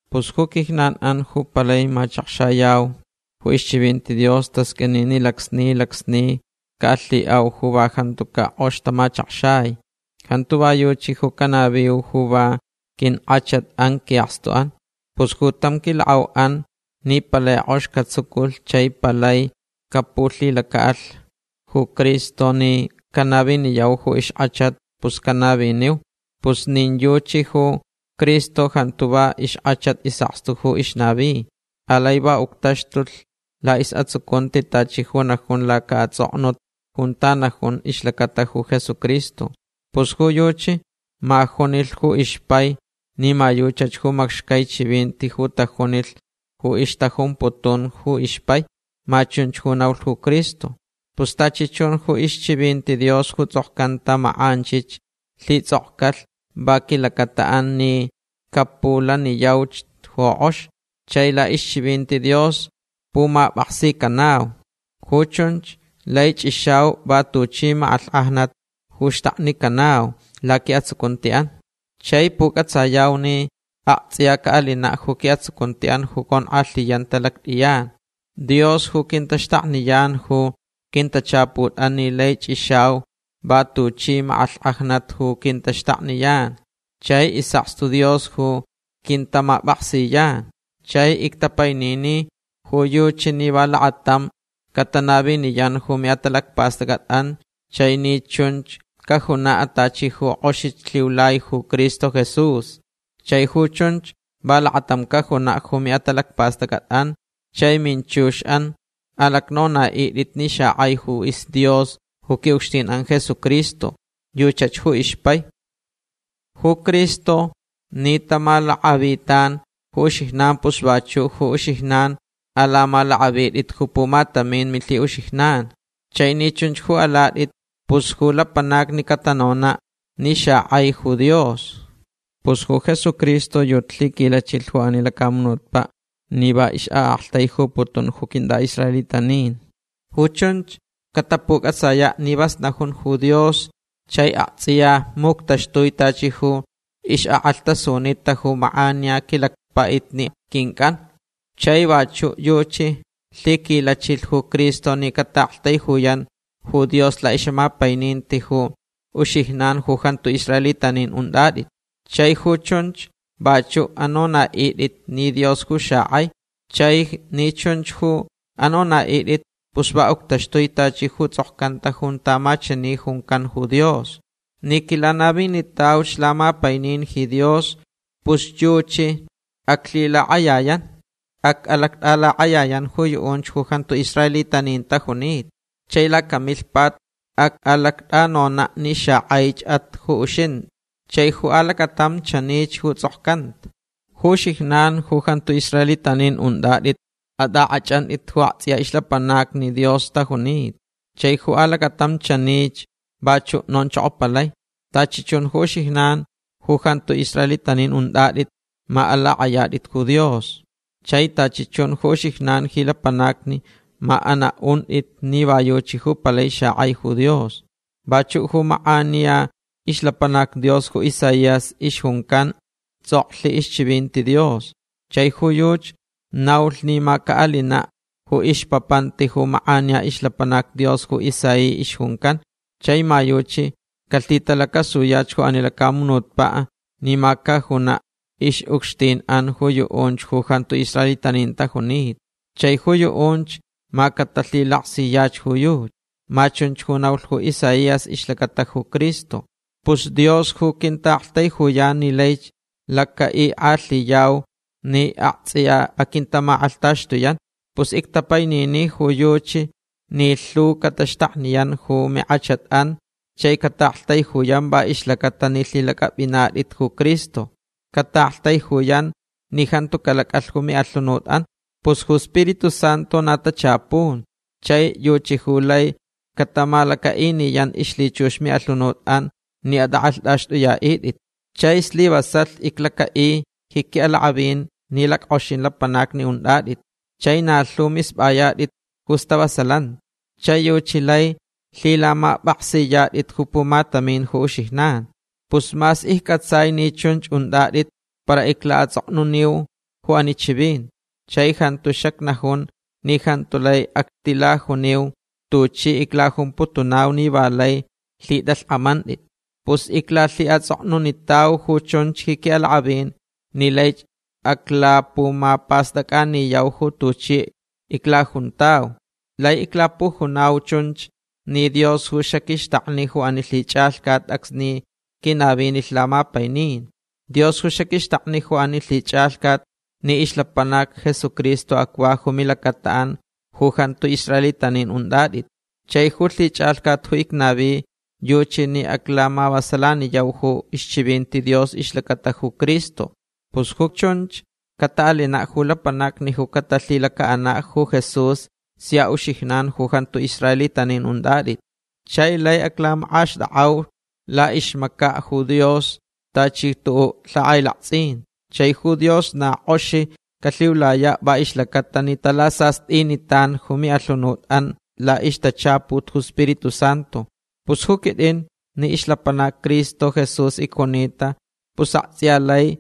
Pus ju quijnan'an ju palai machakxayau ju ixchivinti Dios tasq'uini ni lacsni lacsni ca'alhi'au ju va jantuca' k'ox tamachakxai. Jantu va yuchi ju canaviu ju va quink'achat'an qui'akstu'an. Pus ju tam quilak'au'an ni palai k'ox catsuculh chai palai capulhilaca'alh ju Cristo ni canaviniyau ju ixk'achat pus canaviniu. Pus nin yuchi ju Cristo jantu va ixk'achat is'akstu ju ixnavi. Alai va uctaxtulh la'is'atsucunti tachi ju najun laca'ats'oknut junta najun ixlacata ju Jesucristo. Pus ju yuchi ma junilh ju ixpai ni ma yuchach ju macxcai chivinti ju tajunilh ju ixtajumputun ju ixpai. Ma chunch ju naulh ju Cristo. Pus tachi chun ju ixchivinti Dios ju ts'okcanta mak'anchich lhits'okcalh va quilacata'an ni capulaniyauch ju k'ox. Chai la'ixchivinti Dios pumap'aksicanau. Ju chunch lai ch'ixau va tuchi mak'alhk'ajnat ju xtaknicanauch laqui'atsucunti'an. Chai puc'atsayau ni akts'iya ca'alina' ju qui'atsucunti'an ju conk'alhiyanta lact'iyan. Dios ju quintaxtakniyan ju quintachaput'an ni laich ch'ixauch va tuchi mak'alhk'ajnat ju quintaxtakniyan. Chai is'akstu Dios ju quintamap'aksiyan. Chai ictapainini ju yuchi ni va lakatamch catanaviniyan ju mi'atalacpast'ac'at'an chai ni chun cajuna' tachi ju k'oxich lhiulai ju Cristo Jesús. Chai ju chunch va lakatamch cajuna' ju mi'atalacpast'ac'at'an chai minchux'an alacnona'it'it ni xak'aich ju isDios ju qui'ucxtin'an Jesucristo. Yuchach ju ixpai. Ju Cristo ni tamalak'avitan ju uxijnan pus vachu' ju uxijnan alamalak'avit'it ju pumatamin milhi'uxijnan. Chai ni chunch ju alat'it pus ju lapanacni catanona' ni xak'aich ju Dios. Pus ju Jesucristo yuchi lhiquilachilh ju ani lacamunutpa' ni va ix'a'aktaijuputun ju quint'a'israelitanin. Ju chunch catapuc'atsaya' ni vas najun ju Dios chai akts'iya muctaxtui tachi ju ix'ak'alhtasunitach ju mak'aniya quilacpa'itni quinc'an. Chai vachu' yuchi lhiquilachilh ju Cristo ni cata'aktaijuyan ju Dios la'ix'amapaininti ju uxijnan ju jantu israelitanin unt'at'it. Chai ju chunch vachu' anona'it'it ni Dios ju xak'ai. Chai ni chun ju anona'it'it pus va uctaxtui tachi ju ts'okcanta junta ma chani juncan ju Dios: Ni quilanavinitauch lamapainin ji Dios pus yuchi aclhilak'ayayan. Ac'alact'alak'ayayan ju yu'unch ju jantu israelitanin tajunita. Chai lacamilhpat ac'alact'anona' ni xak'aich'at ju uxint'i. Chai ju alacatam chanich ju ts'okcanta: Ju uxijnan ju jantu israelitanin unt'at'it ma at'ak'ach'ant'it ju akts'iya ixlapanacni Dios tajunita. Chai ju alacatam chanich vachu' nonchokopalai: Tachi chun ju uxijnan ju jantu israelitanin unt'at'it ma alak'ayat'it ju Dios. Chai tachi chun ju uxijnan ji lapanacni ma ana'unt'it ni va yuchi ju palai xak'ai ju Dios. Vachu' ju mak'aniya ixlapanac Dios ju Isaías ixjuncan ts'oklh ixchivinti Dios. Chai ju yuchi naulh ni ma ca'alina' ju ixpapanti ju mak'aniya ixlapanac Dios ju Isaí ixjuncan. Chai ma yuchi calhitalacasuyach ju ani lacamunutpa' ni ma cajuna' ix'ucxtin'an ju yu'unch ju jantu israelitanin tajunita. Chai ju yu'unch ma catalhilaksiyach ju yuchi. Ma chunch ju naulh ju Isaías ixlacata ju Cristo. Pus Dios ju quinta'aktaijuyan ni laich laca'ik'alhiyau ni akts'iya aquintamak'alhtaxtuyan. Pus ictapainini ju yuchi ni lhu cataxtakniyan ju mink'achat'an chai cata'aktaijuyan va ixlaca'atalh ni lhilac'ap'inat'it ju Cristo. Cata'aktaijuyan ni jantu calac'alh ju mi'alhunut'an. Pus ju Spiritu Santu na tachapun chai yuchi ju laich catamalaca'iniyan ixlhichux mi'alhunut'an ni at'ak'alht'axt'uya'it'it. Chai slivasalh iclaca'i ji qui'alak'avin ni lack'oxin lapanacni unt'at'it. Chai na lhu misp'ayat'it ju stavasalanti. Chai yuchi laich lhilamap'aksiyat'it ju pumatamin ju uxijnan. Pus mas icc'atsai ni chunch unt'at'it para icla'ats'oknuniu ju ani chivinti. Chai jantu xacnajun ni jantu lai actilajuniu tuchi iclajumputunau ni va lai lhit'alhk'amant'it. Pus iclalhi'ats'oknunitau ju chunch ji qui'alak'avin ni laich aclapumapast'ac'aniyau ju tuchi iclajuntauch. Laich iclapujunau chunch ni Dios ju xaquixtakni ju ani lhich'alhcat acsni quinavinilh lamapainin. Dios ju xaquixtakni ju ani lhich'alhcat ni ixlapanac Jesucristo acva ju milacata'an ju jantu israelitanin unt'at'it. Chai ju lhich'alhcat ju icnavi yuchi ni aclamavasalaniyau ju ixchivinti Dios ixlacata ju Cristo. Pus ju chunch cata'alina' ju lapanacni ju catalhilaca'ana' ju Jesús sia uxijnan ju jantu israelitanin unt'at'it. Chai laich aclamak'axt'ak'auch la'ixmaca' Dios tachi ju tu'u' lhak'ailakts'in. Chai ju Dios na k'oxich calhiulaya' va ixlacata ni talasast'initan ju mi'alhunut'an la'ixtachaput ju Spiritu Santu. Pus ju quit'in ni ixlapanac Cristo Jesús icjunita pus akts'iya lai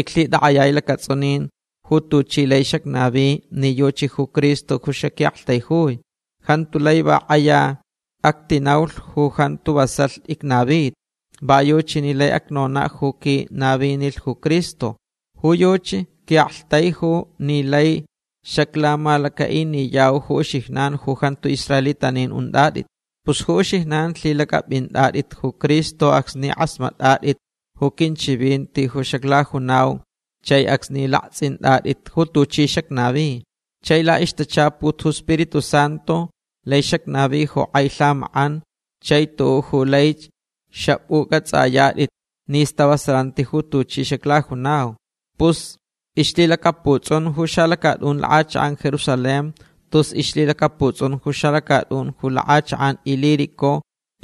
iclhitak'ayai lacats'unin ju tuchi lai xacnavi ni yuchi ju Cristo ju xaqui'aktaijui. Jantu lai va k'aya actinaulh ju jantu vasalh icnavita. Va yuchi ju lai acnona' ju quinavinilh ju Cristo. Ju yuchi qui'aktaijulh ni laich xaclamalaca'iniyauch ju uxijnan ju jantu israelitanin unt'at'it. Pus ju uxijnan lhilac'ap'int'at'it ju Cristo acsni k'asmat'at'it ju quinchivinti ju xaclajunau chai acsni lakts'int'at'it ju tuchi xacnavi. Chai la'ixtachaput ju Spiritu Santu lai xacnavi ju k'ai lhamak'an chai tu'u' ju laich xap'uc'ats'ayat'it ni stavasalanti ju tuchi xaclajunau. Pus ixlhilacaputs'un ju xalacat'un lak'achak'an Jerusalén tus ixlhilacaputs'un ju xalacat'un ju lak'achak'an Ilírico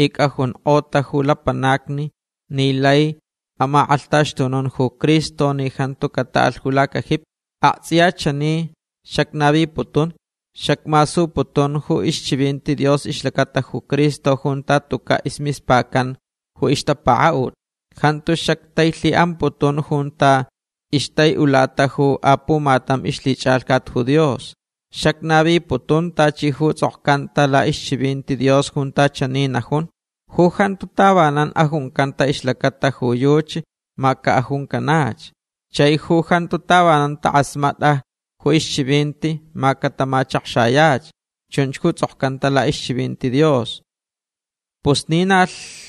ic'ajunk'ota ju lapanacni ni laich amak'alhtaxtunun ju Cristo ni jantu cata'alh ju lacajipi. Akts'iya chani xacnaviputun. Xacmasuputun ju ixchivinti Dios ixlacata ju Cristo junta tuca' ismispacan ju ixtapaka'ut. Jantu xactailhi'amputun junta ixtai'ulata ju apumatam ixlhich'alhcat ju Dios. Xacnaviputun tachi ju ts'okcantach la'ixchivinti Dios junta chani najun: Ju jantu tavanan ajuncanta ixlacata ju yuchi ma cajuncanach. Chai ju jantu tavanan tak'asmat'a ju ixchivinti ma catamachakxayach. Chunch ju ts'okcanta la'ixchivinti Dios. Pus ni na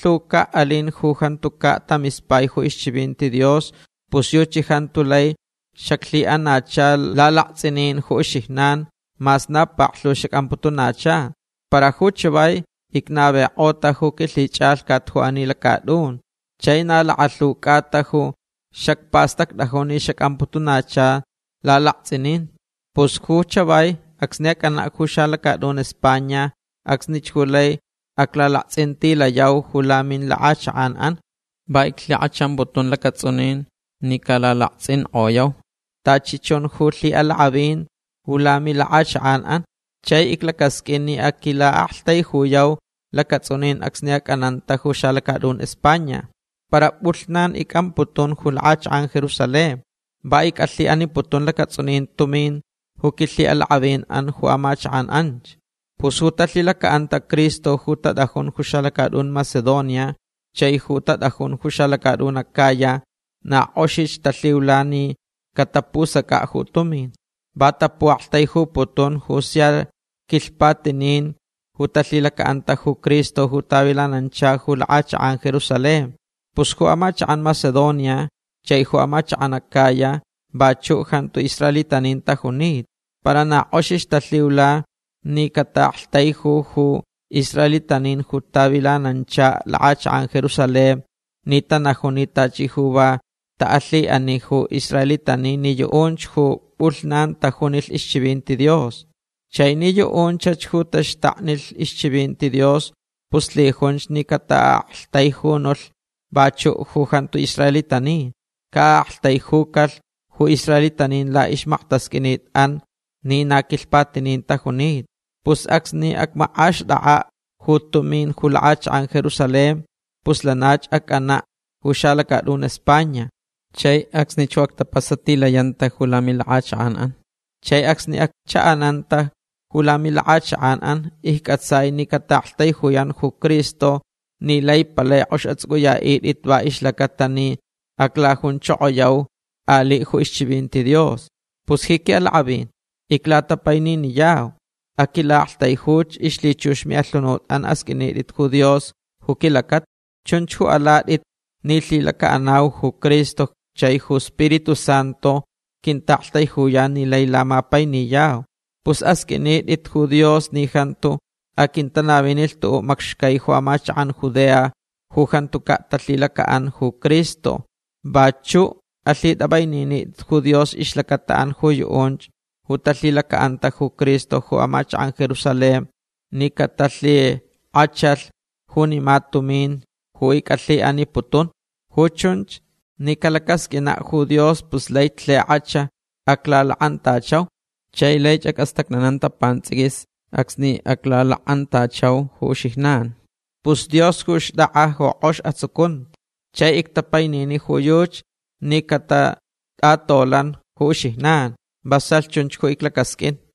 lhuca' alin ju jantuca' tamispai ju ixchivinti Dios pus yuchi jantu lai xaclhi'anacha lalakts'inin ju uxijnan mas na paklhu xac'amputunacha. Para ju chavai icnavik'ota ju quilhich'alhcat ju ani lacat'un. Chai na lakalhu c'ata ju xacpastact'ajun ni xac'amputunacha lalakts'inin. Pus ju chavai acsni ac'ana' ju xalacat'un España acsnich ju lai aclalakts'intilayau ju lamilak'achak'an'an. Va iclhik'achamputun lacats'unin ni calalakts'ink'oyauch tachi chun ju lhi'alak'avin ju lamilak'achak'an'an. Chai iclacasq'uin ni aquila'aktaijuyauch lacats'unin acsni ac'ananta ju xalacat'un España. Para p'ulhnan ic'amputun ju lak'achak'an Jerusalén. Va ic'alhi'aniputun lacats'unin tumin ju quilhi'alak'avin'an ju amachak'an anch. Pus ju talhilaca'anta Cristo ju tat'ajun ju xalacat'un Macedonia chai ju tat'ajun ju xalacat'un Acaya na k'oxich talhiula ni catapusac'a' ju tumin. Va tapu'aktaijuputun ju sia quilhpatinin ju talhilaca'anta ju Cristo ju tavilananchalhch ju lak'achak'an Jerusalén. Pus ju amachak'an Macedonia chai ju amachak'an Acaya vachu' jantu israelitanin tajunita. Para na k'oxich talhiula ni ca'a'aktaiju ju israelitanin ju tavilanancha lak'achak'an Jerusalén ni tanajun ni tachi ju va ta'alhi'ani ju israelitanin ni yu'unch ju p'ulhnan tajunilh ixchivinti Dios. Chai ni yu'unchach ju taxtaknilh ixchivinti Dios pus lhijunch ni cata'a'aktaijunulhch vachu' ju jantu israelitanin. Ca'a'aktaijucalh ju israelitanin la'ixmaktasq'uinit'an ni na quilhpatinin tajunita. Pus acsni acmak'axt'ak'a' ju tumin ju lak'achak'an Jerusalén pus lanach ac'anach ju xalacat'un España. Chai acsnich ju actapasatilayanta ju lamilak'achak'an'an. Chai acsni accha'ananta ju lamilak'achak'an'an icc'atsai ni cata'aktaijuyan ju Cristo ni lai palai k'ox ats'uc'uya'it'it va ixlacata ni aclajunchokoyauch ali' ju ixchivinti Dios. Pus ji qui'alak'avin iclatapaininiyau. Aquila'aktaijuch. Ixlhichux mi'alhunut'an asq'uinit'it ju Dios ju quilacata. Chunch ju alat'it ni lhilaca'anau ju Cristo chai ju Spiritu Santu quinta'aktaijuyan ni lai lamapainiyau. Pus asq'uinit'itch ju Dios ni jantu aquintanavinilh tu'u' macxcai ju amachak'an Judea ju jantuca' talhilaca'anta ju Cristo. Vachu' alhit'ap'aininit'it ju Dios ixlacata'an ju yu'unch ju talhilaca'anta ju Cristo ju amachak'an Jerusalén ni catalhik'achalhch junima tumin ju ic'alhi'aniputunch. Ju chunch ni calacasq'uina' ju Dios pus laich lhik'ach aclalak'antachau. Chai laich ac'astacnananta pants'iquis acsni aclalak'antachau ju uxijnan. Pus Dios ju xt'ak'a ju k'ox atsucunti. Chai ictapainini ju yuchi ni catat'atolan ju uxijnan. Vasalh chunch ju iclacasq'uinch.